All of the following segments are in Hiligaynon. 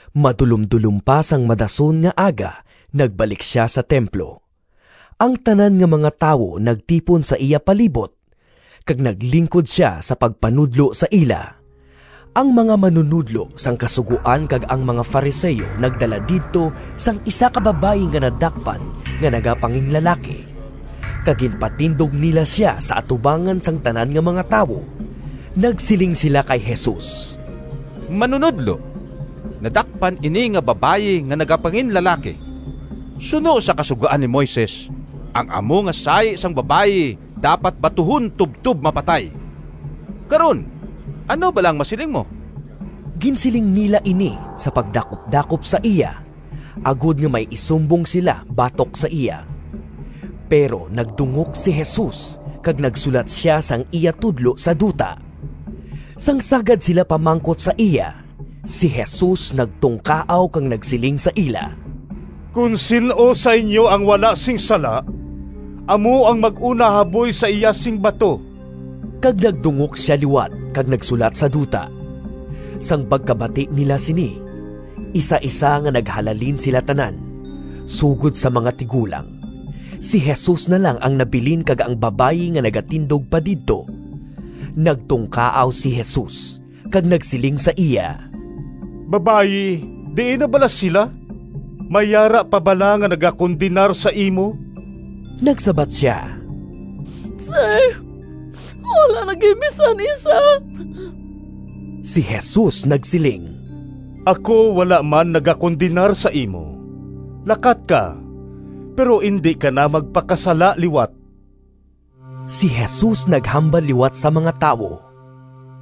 Madulomdulom pa sang madason nga aga nagbalik sia sa templo. Ang tanan nga mga tawo nagtipon sa iya palibot, kag naglingkod sia sa pagpanudlo sa ila. Ang mga manunodlo sang Kasugoan kag ang mga Fariseo nagdala didto sang isa ka babayi nga nadakpan nga nagapanginlalaki, kag ginpatindog nila sia sa atubangan sang tanan nga mga tawo. Nagsiling sila kay Jesus, “Manunodlo, nadakpan ini nga babayi nga nagapanginlalaki. Suno sa Kasugoan ni Moises ang amo nga sahi sang babayi dapat batuhon tubtob mapatay. Karon, ano bala ang masiling mo?” Ginsiling nila ini sa pagdakupdakop sa iya, agod nga may isumbong sila batok sa iya. Pero nagdungok si Jesus kag nagsulat sia sang iya tudlo sa duta. Sang sagad sila pamangkot sa iya, si Jesus nagtungkaaw kag nagsiling sa ila, “Kon sin-o sa inyo ang wala sing sala, amo ang mag-una haboy sa iya sing bato.” Kag nagdungok sia liwat kag nagsulat sa duta. Sang pagkabati nila sini, isaisa nga naghalalin sila tanan, sugod sa mga tigulang. Si Jesus na lang ang nabilin kag ang babayi nga nagatindog pa didto. Nagtungkaaw si Jesus kag nagsiling sa iya, “Babayi, diin na bala sila? May yara pa bala nga nagakondenar sa imo?” Nagsabat sia, “Sir, wala na gid bisan isa.” Si Jesus nagsiling, “Ako wala man nagakondenar sa imo. Lakat ka, pero indi ka na magpakasala liwat.”] Si Jesus naghambal liwat sa mga tawo,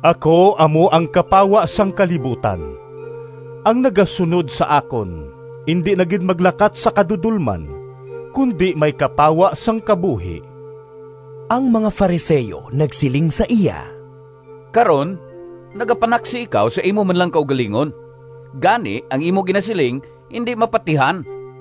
“Ako amo ang kapawa sang kalibutan. Ang nagasunod sa akon indi na gid maglakat sa kadudolman, kundi may kapawa sang kabuhi.” Ang mga Fariseo nagsiling sa iya, “Karon nagapanaksi ikaw sa imo man lang kaugalingon. Gani ang imo ginasiling indi mapatihan.”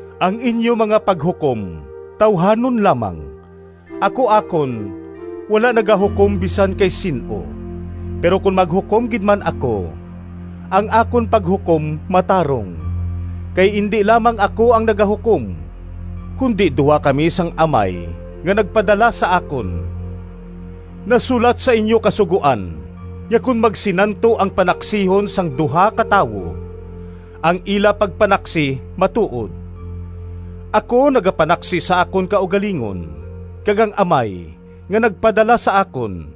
Ang inyo mga paghukom tawuhanon lamang. Ako akon wala nagahukom bisan kay sin-o. Pero kon maghukom gid man ako, ang akon paghukom matarong, kay indi lamang ako ang nagahukom, kundi duha kami sang Amay nga nagpadala sa akon. Nasulat sa inyo Kasugoan nga kon magsinanto ang panaksihon sang duha ka tawo, ang ila pagpanaksi matuod. Ako nagapanaksi sa akon kaugalingon, kag ang Amay nga nagpadala sa akon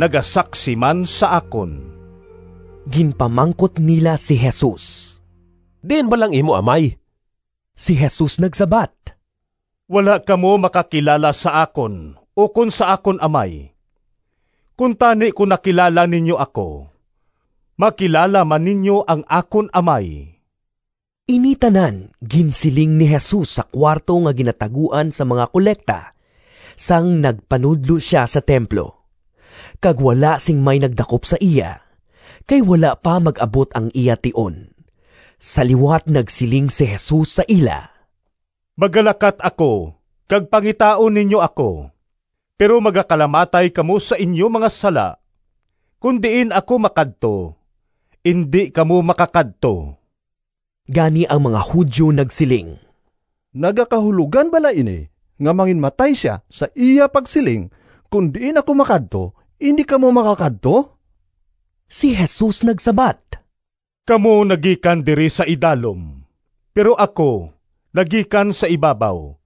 nagasaksi man sa akon.” Ginpamangkot nila si Jesus, “Diin bala ang imo amay?” Si Jesus nagsabat, “Wala kamo makakilala sa akon ukon sa akon Amay. Kuntani kon nakilala ninyo ako, makilala man ninyo ang akon Amay.” Ini tanan ginsiling ni Jesus sa kuwarto nga ginataguan sang mga kolekta, sang nagpanudlo sia sa templo. Kag wala sing may nagdakop sa iya, kay wala pa mag-abot ang iya tion. Sa liwat nagsiling si Jesus sa ila, “Magalakat ako, kag pangitaon ninyo ako, pero magakalamatay kamo sa inyo mga sala. Kon diin ako makadto, indi kamo makakadto.” Gani ang mga Judio nagsiling, “Nagakahulogan bala ini nga manginmatay sia, sa iya pagsiling, ‘Kon diin ako makadto, indi kamo makakadto’?” Si Jesus nagsabat, “Kamo nagikan diri sa idalom, pero ako nagikan sa ibabaw.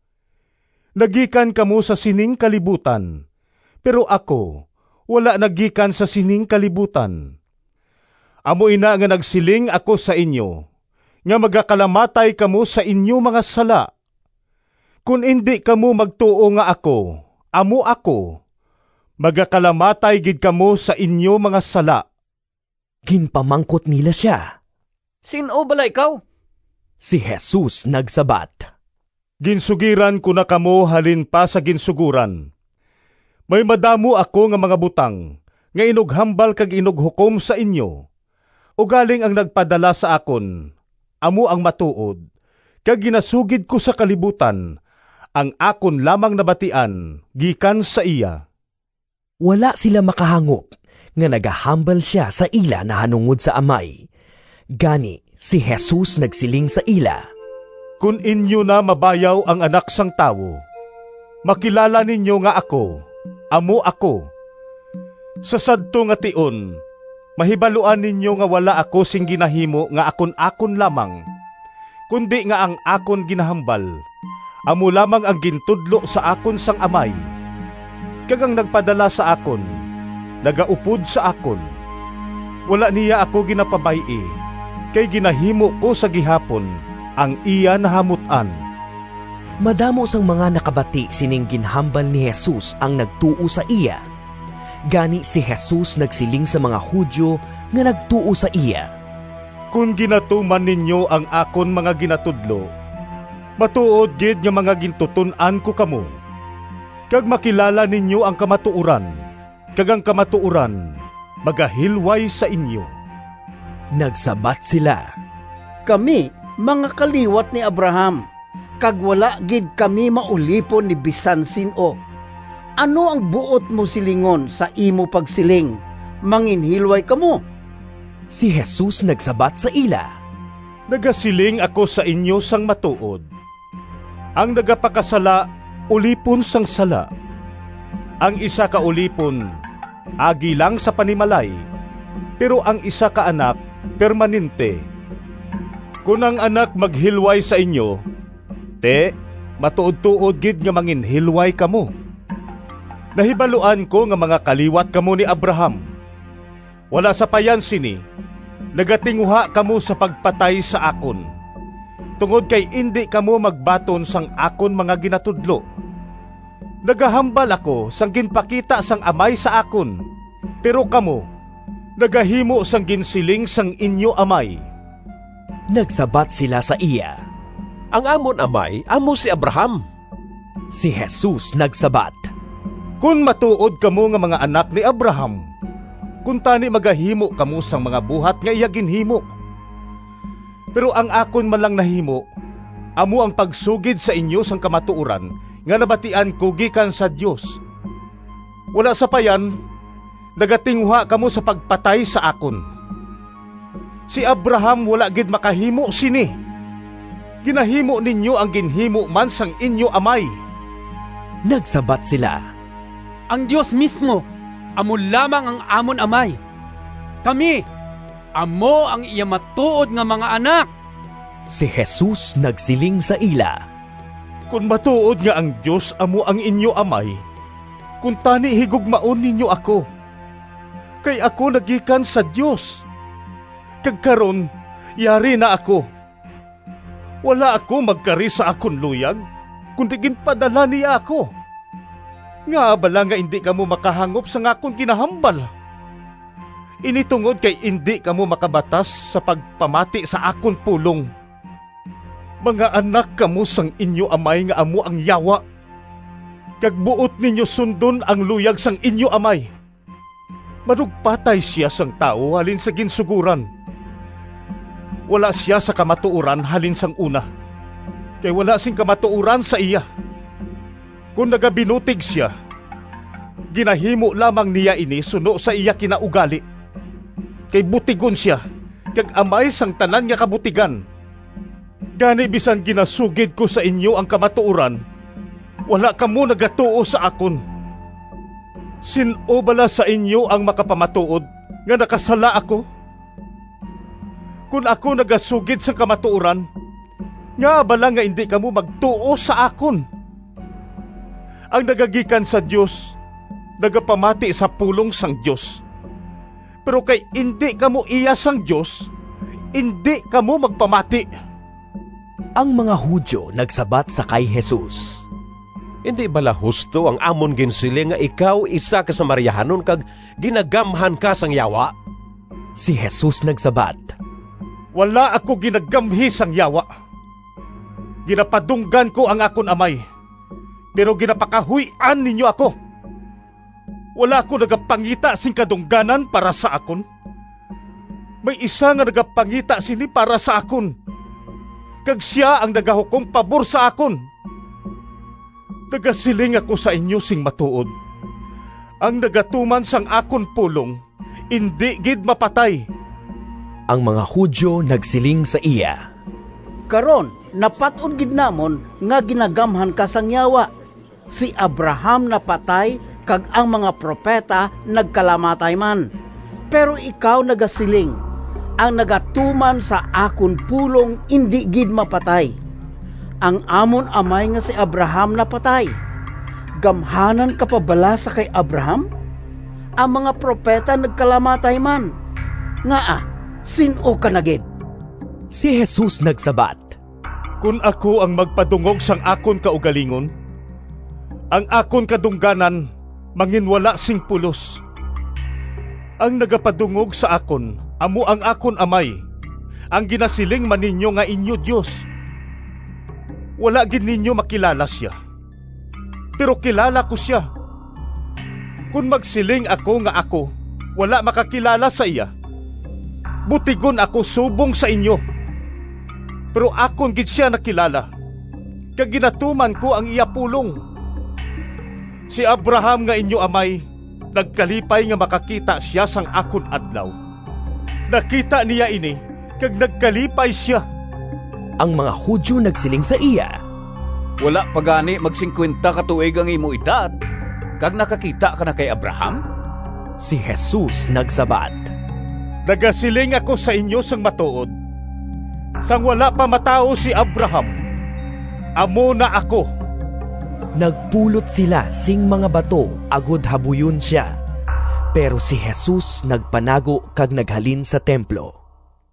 Nagikan kamo sa sining kalibutan, pero ako wala nagikan sa sining kalibutan. Amo ina nga nagsiling ako sa inyo nga magakalamatay kamo sa inyo mga sala. Kon indi kamo magtuo nga ‘Ako Amo Ako’, magakalamatay gid kamo sa inyo mga sala.” Ginpamangkot nila sia, “Sin-o bala ikaw?” Si Jesus nagsabat, “Ginsugiran ko na kamo halin pa sa ginsugoran. May madamo ako nga mga butang nga inughambal kag inughukom sa inyo. Ugaling ang nagpadala sa akon amo ang matuod, kag ginasugid ko sa kalibutan ang akon lamang nabatian gikan sa iya.” Wala sila makahangop nga nagahambal sia sa ila nahanungod sa Amay. Gani si Jesus nagsiling sa ila, “Kon inyo na mabayaw ang Anak sang Tawo, makilala ninyo nga ‘Ako Amo Ako’. Sa sadto nga tion mahibaluan ninyo nga wala ako sing ginahimo nga akon-akon lamang, kundi nga ang akon ginahambal amo lamang ang gintudlo sa akon sang Amay. Kag ang nagpadala sa akon nagaupod sa akon. Wala niya ako ginapabay-i, kay ginahimo ko sa gihapon ang iya nahamut-an.” Madamo sang mga nakabati sining ginhambal ni Jesus ang nagtuo sa iya. Gani si Jesus nagsiling sa mga Judio nga nagtuo sa iya, “Kon ginatuman ninyo ang akon mga ginatudlo, matuod gid nga mga gintuton-an ko kamo, kag makilala ninyo ang kamatuoran, kag ang kamatuoran magahilway sa inyo.” Nagsabat sila, “Kami mga kaliwat ni Abraham, kag wala gid kami maulipon ni bisan sin-o. Ano ang buot mo silingon sa imo pagsiling, ‘Manginhilway kamo’?” Si Jesus nagsabat sa ila, “Nagasiling ako sa inyo sang matuod: ang nagapakasala ulipon sang sala. Ang isa ka ulipon agi lang sa panimalay, pero ang isa ka anak permanente. Kon ang Anak maghilway sa inyo, ti, matuodtuod gid nga manginhilway kamo. Nahibaluan ko nga mga kaliwat kamo ni Abraham. Wala sapayan sini nagatinguha kamo sa pagpatay sa akon, tungod kay indi kamo magbaton sang akon mga ginatudlo. Nagahambal ako sang ginpakita sang Amay sa akon, pero kamo nagahimo sang ginsiling sang inyo amay.” Nagsabat sila sa iya, “Ang amon amay amo si Abraham.” Si Jesus nagsabat, “Kon matuod kamo nga mga anak ni Abraham, kuntani magahimo kamo sang mga buhat nga iya ginhimo. Pero ang akon man lang nahimo amo ang pagsugid sa inyo sang kamatuoran nga nabatian ko gikan sa Dios. Wala sapayan, nagatinguha kamo sa pagpatay sa akon. Si Abraham wala gid makahimo sini! Ginahimo ninyo ang ginhimo man sang inyo amay.” Nagsabat sila, “Ang Dios mismo amo lamang ang amon Amay. Kami amo ang iya matuod nga mga anak.” Si Jesus nagsiling sa ila, “Kon matuod nga ang Dios amo ang inyo amay, kuntani higugmaon ninyo ako, kay ako nagikan sa Dios, kag karon yari na ako. Wala ako magkari sa akon luyag, kundi ginpadala niya ako. Ngaa bala nga indi kamo makahangop sang akon ginahambal? Ini tungod kay indi kamo makabatas sa pagpamati sa akon pulong. Mga anak kamo sang inyo amay nga amo ang Yawa, kag buot ninyo sundon ang luyag sang inyo amay. Manugpatay sia sang tawo halin sa ginsugoran. Wala sia sa kamatuoran halin sang una, kay wala sing kamatuoran sa iya. Kon nagabinutig sia, ginahimo lamang niya ini suno sa iya kinaugali, kay butigon sia kag amay sang tanan nga kabutigan. Gani bisan ginasugid ko sa inyo ang kamatuoran, wala kamo nagatuo sa akon. Sin-o bala sa inyo ang makapamatuod nga nakasala ako? Kon ako nagasugid sang kamatuoran, ngaa bala nga indi kamo magtuo sa akon? Ang nagagikan sa Dios nagapamati sa pulong sang Dios. Pero, kay indi kamo iya sang Dios, indi kamo magpamati.” Ang mga Judio nagsabat sa kay Jesus, “Indi bala husto ang amon ginsiling nga ikaw isa ka Samariahanon, kag ginagamhan ka sang yawa?” Si Jesus nagsabat, “Wala ako ginagamhi sang yawa. Ginapadunggan ko ang akon amay, pero ginapakahuy-an ninyo ako. Wala ako nagapangita sing kadungganan para sa akon. May isa nga nagapangita sini para sa akon, kag sia ang nagahukom pabor sa akon. Nagasiling ako sa inyo sing matuod: ang nagatuman sang akon pulong indi gid mapatay.” Ang mga Judio nagsiling sa iya, “Karon napat-od gid namon nga ginagamhan ka sang yawa! Si Abraham napatay kag ang mga propeta nagkalamatay man, pero ikaw nagasiling, ‘Ang nagatuman sa akon pulong indi gid mapatay.’ Ang amon amay nga si Abraham napatay. Gamhanan ka pa bala sa kay Abraham? Ang mga propeta nagkalamatay man. Ngaa, sin-o ka na gid?” Si Jesus nagsabat, “Kon ako ang magpadungog sang akon kaugalingon, ang akon kadungganan manginwala sing pulos. Ang nagapadungog sa akon amo ang akon Amay—ang ginasiling man ninyo nga inyo Dios. Wala gid ninyo makilala sia, pero kilala ko sia. Kon magsiling ako nga ako wala makakilala sa iya, butigon ako subong sa inyo. Pero akon gid sia nakilala, kag ginatuman ko ang iya pulong. Si Abraham nga inyo amay nagkalipay nga makakita sia sang akon adlaw. Nakita niya ini kag nagkalipay sia.” Ang mga Judio nagsiling sa iya, “Wala pa gani magsingkuwenta ka tuig ang imo edad, kag nakakita ka na kay Abraham?” Si Jesus nagsabat, “Nagasiling ako sa inyo sang matuod: sang wala pa matawo si Abraham, ‘Amo na Ako’.” Nagpulot sila sing mga bato agod habuyon sia, pero si Jesus nagpanago kag naghalin sa templo.